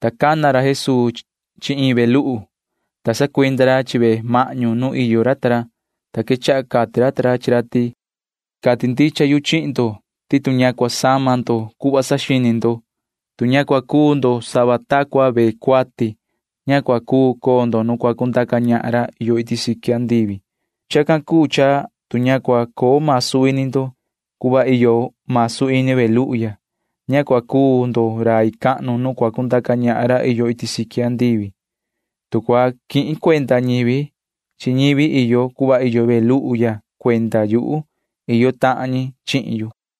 Ta cana ra Jesuu chi iin ve luhu, ta sacuinda ra chi ve mahñu nu iyo ra ta ra, ta quechaha cati ra chi ra ta ra ti: ―Cati ndicha yu chihin ndo ti tu ña cua sama ndo cuhva saxini ndo, tu ña cua cuu ndo cuhva iyo ve cuati, ña cua cuu coo ndo nu cua cundaca ñahan ra iyo iti siqui andivi. Chacan cuu cha tu ña cua coo masu ini ndo cuhva iyo masu ini ve luhu ya, ña cua cuu ndo rai cahnu nu cua cundaca ñahan ra iyo iti siqui andivi. Tu cua quihin cuenda ñivi chi ñivi iyo cuhva iyo ve luhu ya cuenda yuhu, iyo tahan ñi chihin yu.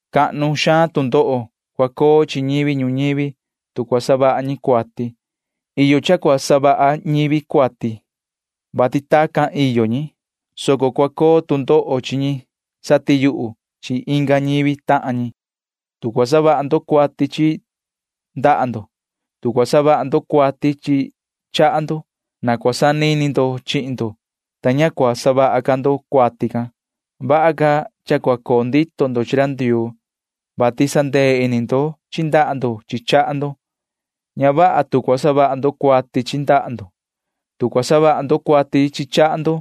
Cua coo tu cuihya ini chi ñivi ñuñivi, vati cua savaha ñi cuati. Iyo cha cua savaha ñivi cuati, vati tacan iyo ñi, soco cua coo tu cuihya ini chi ñi satiyuhu chi inga ñivi tahan ñi. ’Tu cua savaha ndo cuati chi ndaha ndo, tu cua savaha ndo cuati chi chaha ndo, na cua sanini ndo chihin ndo, ta ña cua savaha ca ndo cuati can. Vaha ca cha cua coo ndito ndo chi ra Ndioo, vati sandee ini ndo chi ndaha ndo chi chaha ndo. Ña vaha tu cua savaha ndo cuati chi ndaha ndo, tu cua savaha ndo cuati chi chaha ndo,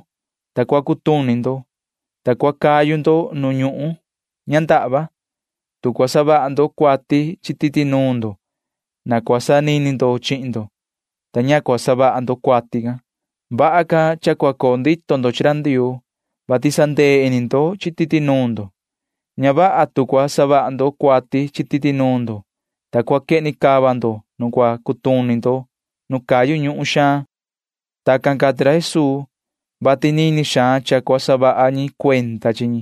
ta cua cutuni ndo, ta cua cayu ndo nu ñuhun ña ndahva. Tu cua savaha ndo cuati chi titi nuun ndo, na cua sanini ndo chihin ndo, ta ña cua savaha ndo cuati can. Vaha ca cha cua coo ndito ndo chi ra Ndioo, vati sandee ini ndo chi titi nuun ndo. Ña vaha tu cua savaha ndo cuati chi titi nuun ndo, ta cua quehni cava ndo nu cua cutuni ndo nu cayu ñuhun xaan. [Tacan cati ra Jesuu, vati nini xaan cha cua saha ñi cuenda chi ñi.]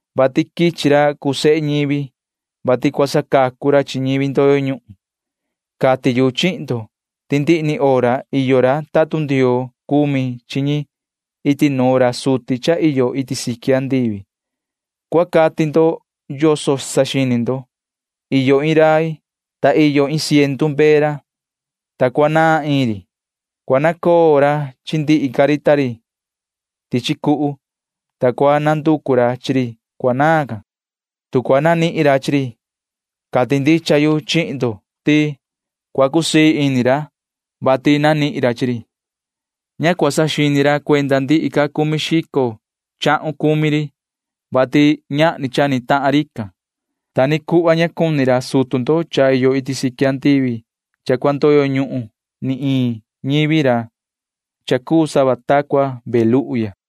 vati quichi ra cuu sehe ñivi, vati cua sacacu ra chi ñivi ndoyo ñuhun. Cati yu chihin ndo ti ndihi ni hora iyo ra tatun Ndioo cumi chi ñi iti nuun ra suti cha iyo iti siqui andivi. ’Cua cati ndo yoso saxini ndo. Iyo iin rai, ta iyo iin ciendu mbee ra, ta cuanaan iin ri. Cua nacoo ra chi ndihi ca ri tichi cuhu, ta cua nanducu ra chi ri cuanaan. Tu cua nanihin ra chi ri, cati ndicha yu chihin ndo ti cua cusii ini ra, vati ni nanihin ra chi ri. Ña cua saxini ra cuenda ndihi ca cumi xico chahun cumi ri, vati ñahni cha ni tahan rican. Ta ni cuhva ña cuni ra sutu ndo cha iyo iti siqui andivi cha cua ndoyo ñuhun ni iin ñivi ra cha cuu sava ta cua ve luhu ya.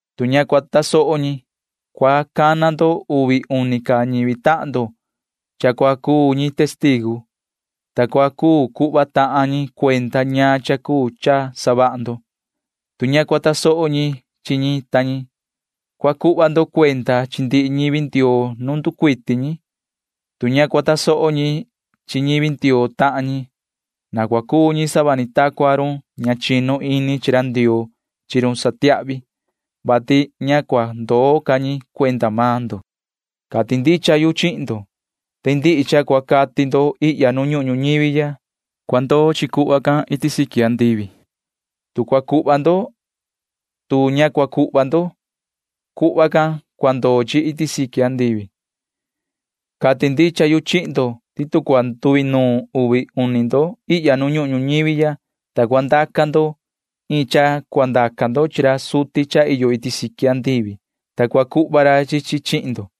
Tu ña cua tasoho ñi, na cua cundaca ndo inga uvi uni tahan ndo vehe ñi, vati tacan cua cuu ñi testigu, ta cua cuu cuhva tahan ñi cuenda ñaan cha cuu cha savaha ndo. Tu ña cua tasoho ñi chi ñi ta ñi, cua cuhva ndo cuenda chi ndihi ñivi Ndioo nu nducuiti ñi. Tu ña cua tasoho ñi chi ñivi Ndioo tahan ñi, na cua cuu ñi sava ta cua run ña chinu ini chi ra Ndioo chi run satiahvi, [vati ña cua ndoo ca ñi cuenda maan ndo]. ’Cati ndicha yu chihin ndo ti ndihi cha cua cati ndo ihya nu ñuhun ñuñivi ya―cua ndoo chi cuhva can iti siqui andivi. Tu cua cuhva ndo, tu ña cua cuhva ndo, cuhva can cua ndoo chi iti siqui andivi. ’Cati ndicha yu chihin ndo ti tu cua nduinuun uvi ndo ihya nu ñuhun ñuñivi ya, ta cua ndaca ndo chacan chi ra suti cha iyo iti siqui andivi, cua cuhva ra chi chi chihin ndo,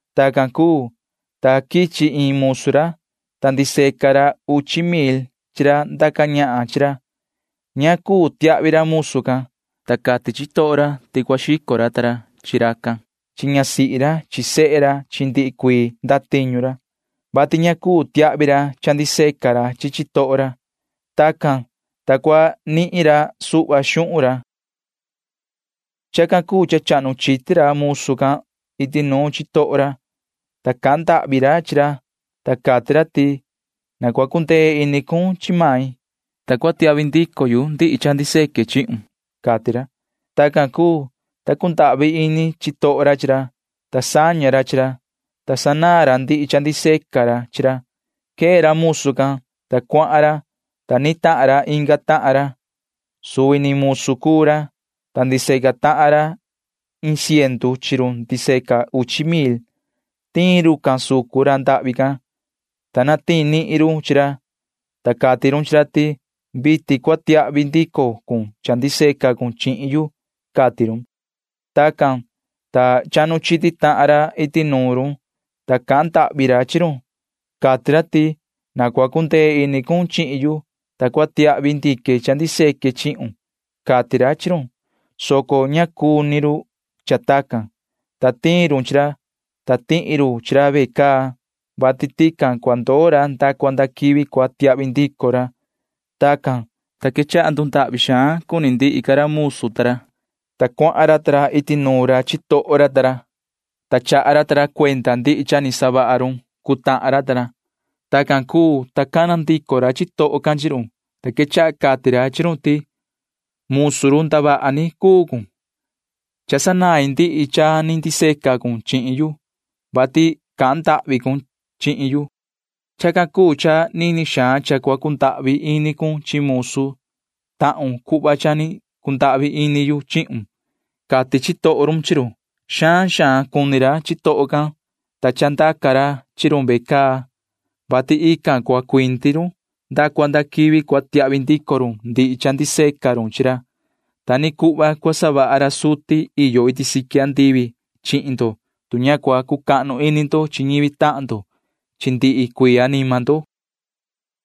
Tacan cuu, ta quichi iin ra musu ra, ta ndiseca ra uchi mil chi ra ndaca ñahan chi ra. Ña cuu tiahvi ra musu can, ta cati chitoho ra ti cua xico ra ta ra chi racan chi ñasihi ra chi sehe ra chi ndihi cuii ndatiñu ra, [vati ña cuu tiahvi ra cha ndiseca ra chi chitoho ra]. Tacan, ta cua nihin ra suhva xuhun ra. Chacan cuu cha chahnu chiti ra musu can iti nuun chitoho ra, ta cahan ndahvi ra chi ra, ta cati ra ti: “Na cua cundee ini cun chi main, ta cua tiahvi ndico yu ndihi cha ndiseque chihun,” cati ra. Tacan cuu, ta cundahvi ini chitoho ra chi ra, ta saña ra chi ra, ta sanaan ra ndihi cha ndiseca ra chi ra. Quee ra musu can, ta cuahan ra, ta nitahan ra inga tahan ra. Suvi ni musu cuu ra, ta ndiseca tahan ra iin ciendu chi run ndiseca uchi mil. Tiin rucan sucun ra ndahvi can, ta natiin nihin run chi ra, ta cati run chi ra ti: “Vitin cua tiahvi ndico cun cha ndiseca cun chihin yu,” cati run. Tacan, ta chahnu chiti tahan ra iti nuun run, ta cahan ndahvi ra chi run. Cati ra ti: “Na cua cundee ini cun chihin yu, ta cua tiahvi ndique cha ndiseque chihun,” cati ra chi run, soco ña vaha cuni run cha tacan, ta tiin run chi ra, ta tihi run chi ra ve caa, vati tican cua ndoo ra nda cua nda quivi cua tiahvi ndico ra. Tacan, ta quechaha ndundahvi xaan cuni ndihi ca ra musu ta ra, ta cuahan ra ta ra iti nuun ra chitoho ra ta ra, ta chaha ra ta ra cuenda ndihi cha ni savaha run cuu tahan ra ta ra. Tacan cuu, ta cana ndico ra chitoho can chi run, ta quechaha cati ra chi run ti: “Musu ndavaha ni cuun. Cha sanain ndihi cha ni ndiseca cun chihin yu, vati cahan ndahvi cun chihin yu. Chacan cuu cha nini xaan cha cua cundahvi ini cun chi musu tahun cuhva cha ni cundahvi ini yu chihun,” cati chitoho run chi run. Xaan xaan cuni ra chitoho can, ta chandaca ra chi run ve caa, vati ve caa iyo chi run nda cua nda quivi cua tiahvi ndico run ndihi cha ni ndiseca run chi ra. Ta ni cuhva cua savaha ra suti iyo iti siqui andivi chihin ndo, tu ña cua cucahnu ini maan ndo chi ñivi tahan ndo chi ndihi cuii anima ndo ―cati ra Jesuu chi ra.